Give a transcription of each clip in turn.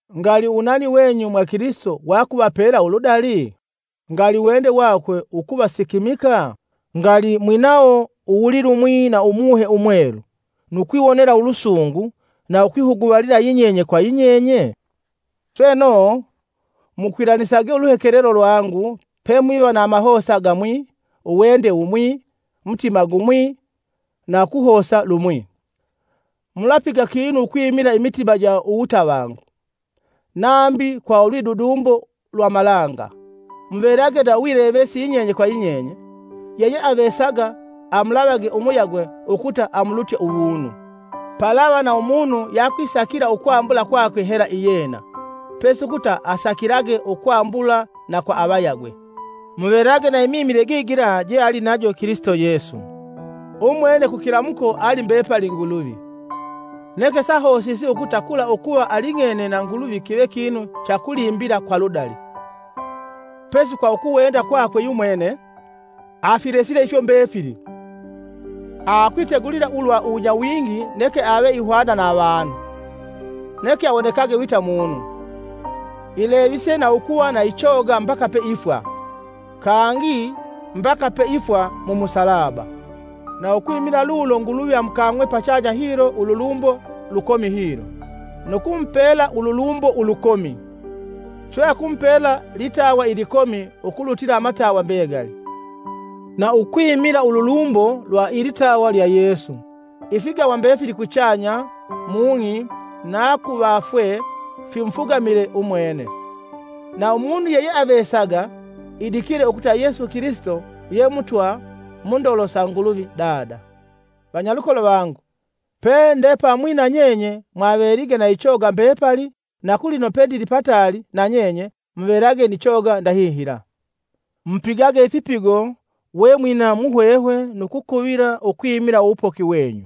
Ngali uwunani wenyu mwa Kilisito wakuvapela uludali? Ngali uwende wakwe ukuvasikimika? Ngali mwinawo uwulilumwi na Umuhe Umwelu nu kwiwonela ulusungu na ukwihuguvalila yinyenye kwa yinyenye? Sweno, mukwilanisage uluhekelelo lwangu pemwiva na amahosa gamwi, uwende wumwi, mutima gumwi na kuhosa lumwi. Mulapiga kinu ukwimila imitima ja uwutavangu, nambi kwa ulwidudumbo lwa malanga, muvelage na uwilevesi yinyenye kwa yinyenye, yeyeavesaga amulavage umuyagwe ukuta amulutye uwunu. Palava na umunu yeakwisakila ukwambula kwakwe hela iyena, pesi ukuta asakilage ukwambula na kwa avayagwe. Muvelage na imimile gigila jealinajo Kilisito Yesu. Umwene kukilamuko ali mbepali Nguluvi, neke sahosisi ukuta kula ukuva aling'ene na Nguluvi kive kinu cha kulimbila kwa ludali. Pesi kwa ukuwenda kwakwe yumwene, Afilesile ifyo mbefili, akwitegulila ulwa uwunyawingi neke ave ihwana na avanu, neke awonekage wita munu. Ilevise na ukuva na ichoga mbaka peifwa, kangi mbaka peifwa mu musalaba. Na ukwimila lulo Nguluvi amukang'we pachanya hilo ululumbo lukomi hilo, nu kumupela ululumbo ulukomi, swe akumupela litawa ilikomi ukulutila amatawa mbegali. Na ukwimila ululumbo lwa ilitawa lya Yesu, ifigawa mbefili kuchanya, mung'i na kuvafwe fimufugamile umwene, na umunu yeyeavesaga idikile ukuta Yesu Kilisito ye Mutwa mundolo sa Nguluvi Dada. Vanyalukolo vangu, pende pamwi nanyenye mwavelige na ichoga mbepali na kulino pendili pataali nanyenye, muvelage ni choga ndahihila. Mupigage ifipigo we mwina muhwehwe nu kukuvila ukwimila uwupoki wenyu,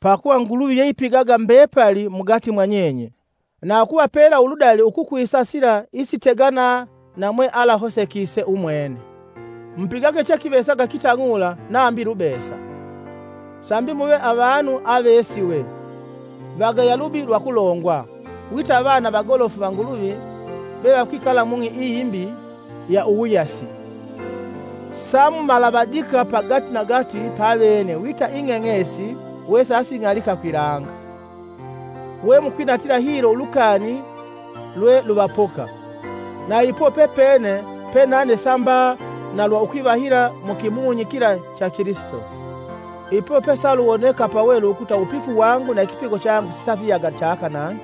pakuva Nguluvi yeipigaga mbepali mugati mwanyenye, na ukuvapela uludali ukukwisa sila isitegana na mwealahosekise umwene. Mupigage chekivesaga kitang'ula nambi lubesa, sambi muve avanu avesiwe, vagaya lubi lwakulongwa, wita avana vagolofu va Nguluvi vevakwikala mung'i iyi imbi ya uwuyasi. Samumalavadika pagatinagati pavene wita ing'eng'esi wesasing'alika kwilanga, wemukwinatila hilo ulukani lwe luvapoka. Na ipo pepene pe nane sa mba na lwa ukwivahila mu kimunyi kila cha Kilisito, ipo pesaluwoneka pawelu ukuta uwupifu wangu na ikipigo changu sisafiyaga chaka nangi.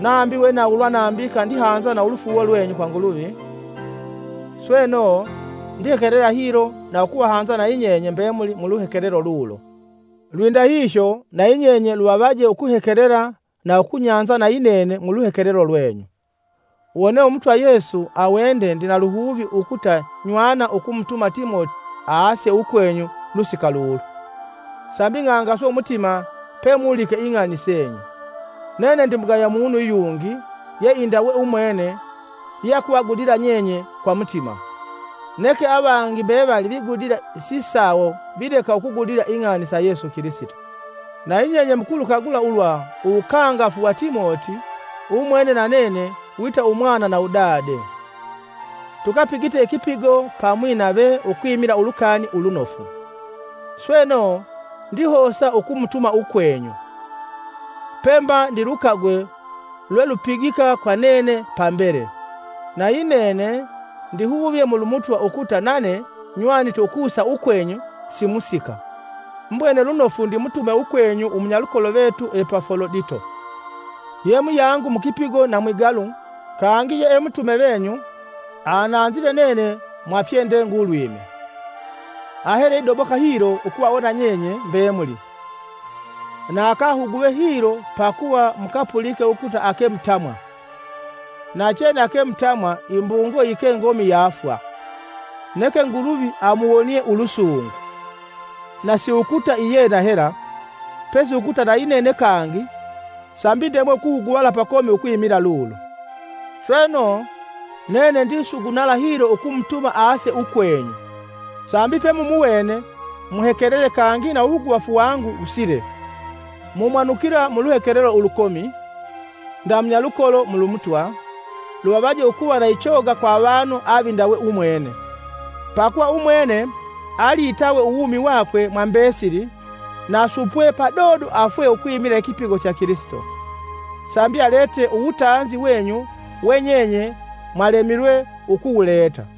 Nambi nawulwe ukwimila avangi pamwinga ulufuuwo lwenyu ululi nambika kwa Nguluvi, Sweno, ndihekelela hilo na ukuvahanza nayi nyenye mbemuli muluhekelelo lulo. Lwindahihyo, nayinyenye luvavaje ukuhekelela na ukunyanza nayinene muluhekelelo lwenyu. Wone Umutwa Yesu awende ndina luhuvi ukuta nywana ukumutuma Timoti aase ukwenyu lusika lulu, sambi ng'angaswe umutima pemulike ing'ani senyu. Nene ndimugaya munu yungi yeindawe umwene yeakuvagudila nyenye kwa mutima. Neke avangi mbevali vigudila sisawo vileka ukugudila ing'ani sa Yesu Kilisito. Nayinyenye mukulukagula ulwa uwukangafu wa Timoti, umwene na nene wita Umwana na Udade, tukapigite ikipigo pamwi nave ukwimila Ulukani Ulunofu, sweno, ndihosa ukumutuma ukwenyu, pe mba ndilukagwe lwelupigika kwa nene pambele. Na yinene, ndihuvye mulu Mutwa ukuta nane nywanite ukusa ukwenyu si musika. Mbwene lunofu ndimutume ukwenyu umunyalukolo vetu Epafolodito, ye muyangu mukipigo na mwigalu kangi ye e mutume venyu ananzile nene mwa fyendegulwime. Ahele idoboka hilo ukuvawona nyenye mbemuli na akahuguvee hilo pakuva mukapulike ukuta ake mutamwa. Nachene ake mutamwa imbungo yike ngomi ya fwa. Neke Nguluvi amuwonie ulusungu, na siukuta iyena hela, pesi ukuta nayinene kangi sambi ndemwe ukuhuguvala pakomi ukwimila lulo. Sweno, nene ndisugunala hilo ukumutuma aase ukwenyu, sambi pemumuwene muhekelele kangi na uwuhuguvafu wangu wusile. Mu mumwanukila muluhekelelo ulukomi, nda munyalukolo mulu Mutwa. Luvavaje ukuva na ichoga kwa avanu avindawe umwene, pakuva umwene, ali itawe uwumi wakwe mwa mbesili na supwe padodo afwe ukwimila ikipigo cha Kilisito, sambi alete uwutanzi wenyu we nyenye mwalemilwe ukuwuleta.